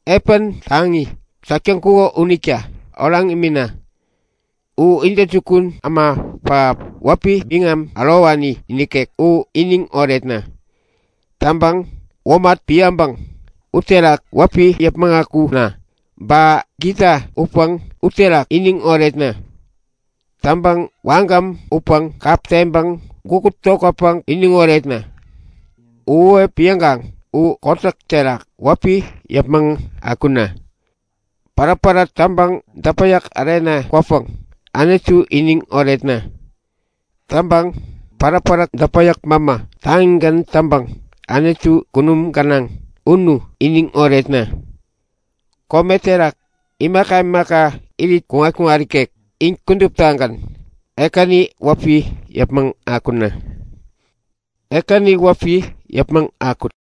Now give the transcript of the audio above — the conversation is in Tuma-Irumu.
Epän taŋi täk täŋkuko unita oraŋ imina! U intäjukun äma pähap, wäpi biŋam ärowani nikek u iniŋ oretna! Täŋpäŋ womat piäŋpäŋ uterak wäpi yäpmäŋ akuna! Ba gita utpäŋ uterak iniŋ oretna! Täŋpäŋ wagäm utpäŋ kap teŋpäŋ gukut tokätpäŋ iniŋ oretna! Uhuwep piäŋkaŋ u kotäk terak wäpi yäpmäŋ akuna! Päräpäräp täŋpäŋ däpäyäk ärena kwäpäŋ Anutu iniŋ oretna! Täŋpäŋ päräpäräp däpäyäk mämä taŋigän täŋpäŋ Anutu kunum gänaŋ unu iniŋ oretna! Kome terak imaka imaka irit kuŋat-kuŋat ikek in kuduptagän Ekäni wäpi yäpmäŋ akuwut! Ekäni wäpi yäpmäŋ akuwut!